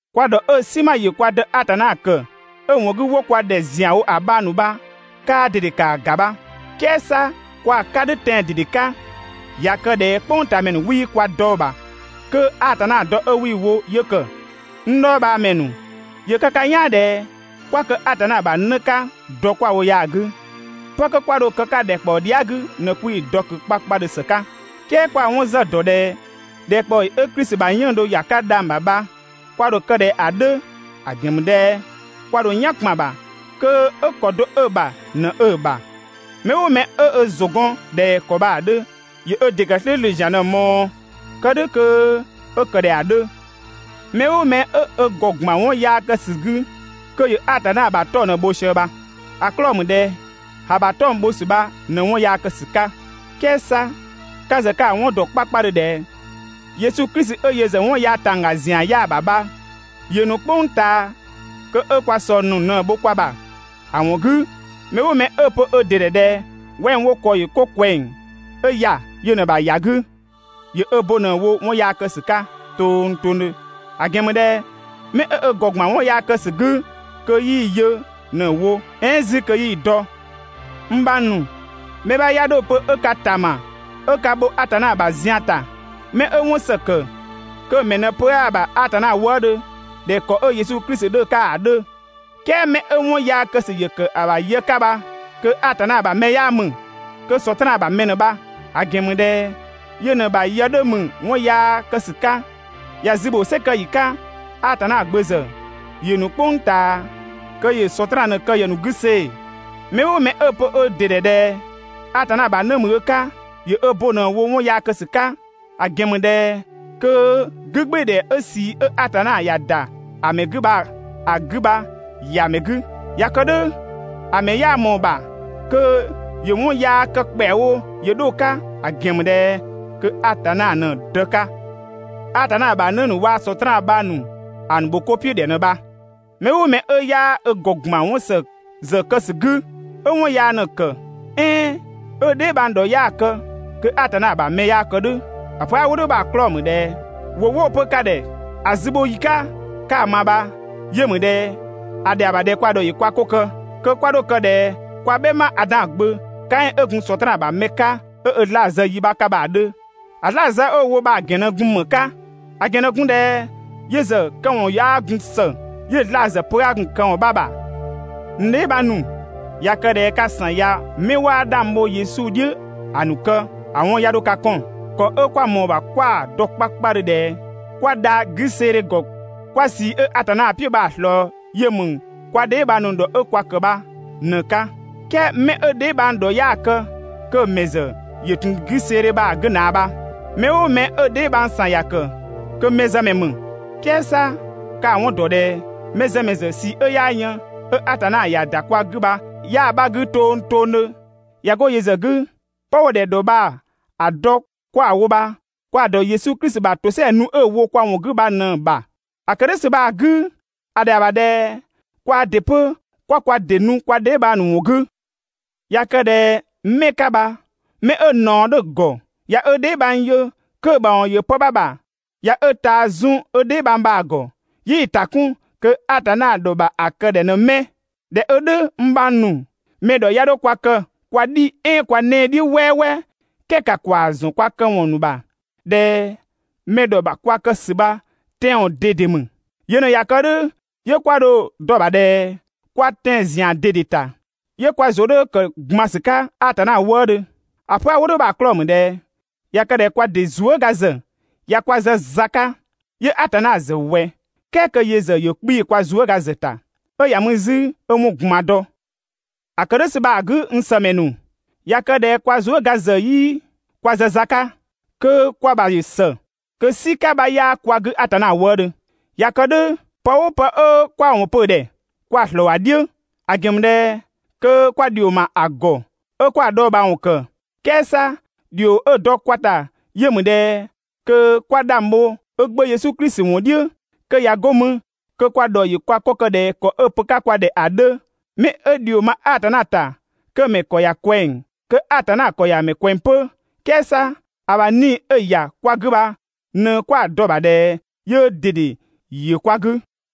Kwa ‑dhɔ 'ö‑ "sinma ‑yö kwa Dë Atanna ‑kë, 'ö‑ ‑wɔn 'gü 'wo kwa ‑dhɛ ‑zianwo ‑a bhang ‑nu bha kaa ꞊dede ‑kaa ‑ga bha. "Kɛɛ 'sa kwa‑ 'ka "dhʋ̈ tɛan‑ ꞊dede 'ka. ꞊Ya kë ꞊dhɛ "kpʋngtaamɛ ‑nu 'wii kwa dɔ‑ ‑bha, kö Atanna dɔ 'ö 'wii‑ wo 'yö ‑kë. N dhɔɔbhaamɛ ‑nu, ‑yö kë ka "yaan ꞊dhɛ 'kwa kë Atanna ‑bha 'në 'ka dɔ 'kwa‑ wo ya‑ 'gü. 'Pë 'kö 'kwa dho kë‑ 'ka ‑dhɛkpaɔ dhia" 'gü ꞊në 'kwii‑ dɔ ꞊kö 'kpakpadhö ‑së 'ka, "kɛɛ kwa‑ 'wɔn ‑zë ‑dɔ ꞊dhɛ ‑dhɛkpaɔyi 'ö Klisi ‑bha 'yënng‑ dho ‑ya 'ka dhang‑ ‑bha bha kwa ‑dho kë ꞊dhɛ ‑a 'dhö, ‑a ‑gɛn ‑mü ꞊dhɛ kwa ‑dho "yan ‑kpan ‑bha kö 'ö ‑kɔ do 'ö‑ ‑bha ꞊në 'ö‑ ‑bha. Mɛ "ʋʋ mɛ 'ö ö ‑zʋ gɔn ꞊dhɛ ‑kɔ bha‑ 'dhö, ‑yö ö ‑dɩ ‑kë "slʋ̈ʋ̈slʋ̈ ‑zian ꞊në‑ ꞊mɔɔ kë "dhʋ̈ kö 'ö kë ꞊dhɛ ‑a 'dhö. Mɛ "ʋʋ mɛ 'ö ö ‑gɔ ‑gban 'wɔn yaa kë ‑sü 'gü kö ‑yö Atanna ‑bha 'tɔng‑ ꞊në‑ bho sië bha, ‑a 'klɔɔ‑ ‑mü ꞊dhɛ ‑a ‑bha 'tɔng‑ bho ‑sü bha ꞊në 'wɔn yaa kë ‑sü 'ka. "Kɛɛ 'sa ka ‑zë ka‑ 'wɔn ‑dɔ 'kpakpadhö ꞊dhɛ Yesu Klisi 'ö yö ‑zë 'wɔn yaa ‑tangga ‑zian 'yaa‑ ‑bha bha, ‑yö ‑nu "kpʋng ꞊taa kö 'ö kwa ꞊sɔng ‑nu ꞊në‑ bho kwa ‑bha. ‑A ‑wɔn 'gü, mɛ "ʋʋ mɛ 'ö‑ pö ö ‑dɩ ‑dhɛ ꞊dhɛ wɛng wo ‑kɔ ‑yö 'ko ꞊kwɛng, ö ‑ya yö ꞊në‑ ‑bha ‑ya 'gü, ‑yö ö bo ꞊në‑ wo 'wɔn yaa kë ‑sü 'ka tongtongdhö, ‑a ‑gɛn ‑mü ꞊dhɛ 'mɛ 'ö ö ‑gɔ ‑gban 'wɔn yaa kë ‑sü 'gü kö 'yii‑ yö ꞊në‑ wo "ɛɛn 'zü kö 'yii‑ dɔ. N bhang ‑nu, mɛ 'bha 'ya 'dho‑ pö 'ö ka ‑tama 'ö ka bho Atanna ‑bha zian ‑ta. 'Mɛ 'ö 'wɔn ‑së ‑kë, kö‑ mɛ ꞊në pö 'aa‑ ‑bha Atanna wëëdhö ꞊dhɛ ‑kɔ 'ö Yesu Klisi 'dhö‑ 'ka ‑a 'dhö. "Kɛɛ 'mɛ 'ö 'wɔn yaa kë ‑sü ‑yö ‑kë ‑bha yë 'ka bha kö Atanna ‑bha mɛ 'yaa ‑mü. Kö Sɔtraan ‑bha mɛ ꞊në bha. ‑A ‑gɛn ‑mü ꞊dhɛ yö ꞊në‑ ‑bha yë 'dhö ‑mü 'wɔn yaa kë ‑sü 'ka. ‑Ya zü ‑bho "sɛ kë ‑yi 'ka. Atanna Gbö ‑zë ‑yö ‑nu "kpʋng ꞊taa kö ‑yö Sɔtraan ꞊në‑ kë ‑yë ‑nu 'gü see‑. Mɛ "ʋʋ mɛ 'ö‑ pö ö ‑dɩ ‑dhɛ ꞊dhɛ Atanna ‑bha 'në ‑mü ö 'ka, ‑yö ö bo ꞊në‑ wo 'wɔn yaa kë ‑sü 'ka, ‑a ‑gɛn ‑mü ꞊dhɛ kö 'gügbɩɩdhɛ 'ö ꞊sii 'ö Atanna ‑ya ‑da ‑a ‑mɛ 'gü bha‑ 'gü bha ‑ya ‑mɛ 'gü. ꞊Ya kë "dhʋ̈ ‑a ‑mɛ 'yaa ꞊mɔɔ‑ ‑bha kö ‑yö 'wɔn yaa kë ‑kpɛawo ‑yö 'dho‑ 'ka, ‑a ‑gɛn ‑mü ꞊dhɛ kö Atanna ꞊në‑ Dë 'ka. Atanna ‑bha 'në ‑nu waa Sɔtraan bhang ‑nu ‑a ‑nu ‑bho 'ko "piʋ̈ ‑dhɛ ꞊në bha. Mɛ "ʋʋ mɛ 'ö 'yaa ö ‑gɔ ‑gban 'wɔn ‑së ‑zë kë ‑sü 'gü 'ö 'wɔn yaa ꞊në‑ ‑kë, "ɛɛn 'ö‑ dheebhang ‑dhɔ 'yaa‑ kë, kö Atanna ‑bha mɛ 'yaa kë "dhʋ̈. ‑A pö 'a‑ wo "dhʋ̈ bha‑ 'klɔɔ‑ ‑mü ꞊dhɛ ‑wʋ 'wo‑ pö ka ‑dhɛ ‑a zü bho ‑yi 'ka 'ka‑ ma bha yö ‑mü ꞊dhɛ ‑a ‑dhɛa ‑bha ꞊dhɛ kwa ‑dhɔ ‑yö kwa 'ko kë, kö 'kwa 'dho kë ꞊dhɛ (kwa "bhɛma Adan gbö) Kaɛn 'ö gun Sɔtraan ‑bha mɛ 'ka 'ö ö 'zlaa‑ zë yi 'bha 'ka bha‑ 'dhö. ‑A 'zlaa‑ zë 'ö‑ wo bha‑ ‑gɛn ꞊në gun ‑më 'ka? ‑A ‑gɛn ꞊në gun ꞊dhɛ yö ‑zë këwɔn 'yaa gun ‑së, 'yö‑ 'zlaa‑ ‑zë pö 'aa gun‑ këwɔn 'bha ‑bha. N dheebhang ‑nu, ꞊ya kë ꞊dhɛ ka ‑san ꞊ya 'mɛ 'waa 'dhang bho Yesu "dhiʋ̈ ‑a ‑nu kë, ‑a 'wɔn 'ya 'dho ka 'kɔn. ‑Kɔ 'ö 'kwa ꞊mɔɔ‑ ‑bha 'kwa‑ dɔ 'kpakpadhö ꞊dhɛ 'kwa dha 'güseedhe ‑gɔ, 'kwa ꞊sii 'ö Atanna "piʋ̈ bha‑ ꞊slɔɔ yö ‑mü kwa dheebhang ‑nu ‑dhɔ 'ö kwa ‑kë bha ꞊në‑ 'ka. "Kɛɛ 'mɛ 'ö‑ dheebhang ‑dhɔ 'yaa‑ kë kö‑ ‑mɛ ‑zë ‑yö ‑tun 'güseedhe bha‑ 'gü ꞊naa bha. Mɛ "ʋʋ mɛ 'ö‑ dheebhang ‑san ‑ya ‑kë, kö mɛzëmɛ ‑mü. "Kɛɛ 'sa ka‑ 'wɔn ‑dɔ ꞊dhɛ mɛzëmɛ ‑zë ꞊sii 'ö 'yaa yën 'ö Atanna ‑ya ‑da kwa 'gü bha 'yaa‑ 'bha 'gü tongtongdhö. ꞊Ya 'go yö ‑zë 'gü, 'pë 'wo‑ ‑dhɛ ‑dhɔ bha‑ dɔ 'kwa‑ wo bha, kwa‑ ‑dɔ Yesu Klisi ‑bha ‑tosɛa nu 'ö‑ wo kwa ‑wɔn 'gü bha ꞊në‑ ‑bha. ‑A ‑kë "dhʋ̈ ‑sü bha‑ 'gü, ‑a ‑dhɛa ‑bha ꞊dhɛ kwaa ‑dɩ 'pö 'kwa kwa ‑dɩ nu kwa dheebhang ‑nu ‑wɔn 'gü. ꞊Ya kë ꞊dhɛ 'mɛ 'ka bha 'mɛ 'ö ꞊naɔ 'dhö‑ ‑gɔ ꞊ya ö dheebhang yö kö‑ ‑bha ‑wɔn ‑yö pë 'bha ‑bha, ꞊ya ö ꞊taa zun ö dheebhang bha‑ ‑gɔ 'yii‑ ‑ta 'kun, kö Atanna ‑dhɔ ‑bha ‑a kë ‑dhɛ ꞊në 'mɛ? ꞊Dhɛ 'ö "dhʋ̈ n bhang ‑nu, mɛ ‑dhɔ 'ya 'dho kwa kë kwa "dhi "ɛɛn kwa 'nɛɛ‑ "dhiʋ̈ "wɛɛwɛɛ, "kɛɛ ‑ka ‑kwaa ‑zɔn kwa këwɔn ‑nu ‑bha ꞊dhɛ mɛ ‑dhɔ ‑bha kwa kë ‑sü bha tɛan‑ ꞊dede ‑mü. Yö ꞊në ꞊ya kë "dhʋ̈ 'yö 'kwa dho‑ dɔ‑ ‑bha ꞊dhɛ kwa tɛan‑ ‑zian ꞊dede ‑ta, 'yö kwa ‑zʋ 'dhö ‑kë ‑gban ‑sü 'ka Atanna wëëdhö. ‑A pö 'a‑ wo "dhʋ̈ bha‑ 'klɔɔ‑ ‑mü ꞊dhɛ ꞊ya kë ꞊dhɛ kwa ‑dɩ zuëga ‑zë ꞊ya kwa zë za 'ka, 'yö Atanna ‑zë ꞊wɛ "kɛɛ kö yö ‑zë ‑yö 'kpii‑ kwa zuëga ‑zë ‑ta 'ö ‑ya mü 'zü 'ö 'wɔn ꞊gban dɔ? ‑A kë "dhʋ̈ ‑sü bha‑ 'gü n ‑sëmɛ ‑nu, ꞊ya kë ꞊dhɛ kwa zuëga ‑zë 'yii kwa zë za 'ka kö kwa ‑bha ‑yö ‑së, kö "sika 'bha 'yaa kwa 'gü Atanna wëëdhö. ꞊Ya kë "dhʋ̈, pë "ʋʋ pë 'ö 'kwa‑ ‑wɔn pö‑ ‑dhɛ kwa‑ ‑slɔɔ ‑a "dhiʋ̈, ‑a ‑gɛn ‑mü ꞊dhɛ kö kwa ‑dhio ‑ma ‑a ‑gɔ 'ö 'kwa‑ dhɔɔbhaawɔn ‑kë. "Kɛɛ 'sa ‑dhio 'ö‑ dɔ kwa ‑ta yö ‑mü ꞊dhɛ kö 'kwa 'dhang bho ö Gbö Yesu Klisi ‑wɔn "dhiʋ̈, kö ꞊ya 'go mü kö kwa ‑dhɔ ‑yö kwa 'ko kë ꞊dhɛ ‑kɔ 'ö‑ pö‑ 'ka kwa ‑dhɛ ‑a 'dhö. 'Mɛ 'ö ‑dhio ma Atanna ‑ta kö‑ ‑mɛ ‑kɔ ‑ya ꞊kwɛng, kö Atanna ‑kɔ ‑ya ‑mɛ ꞊kwɛng 'pö. "Kɛɛ 'sa ‑a ‑bha 'Nii‑ 'ö‑ ‑ya kwa 'gü bha ꞊në 'kwa‑ dɔ‑ ‑bha ꞊dhɛ yöö ꞊dede ‑yö kwa 'gü.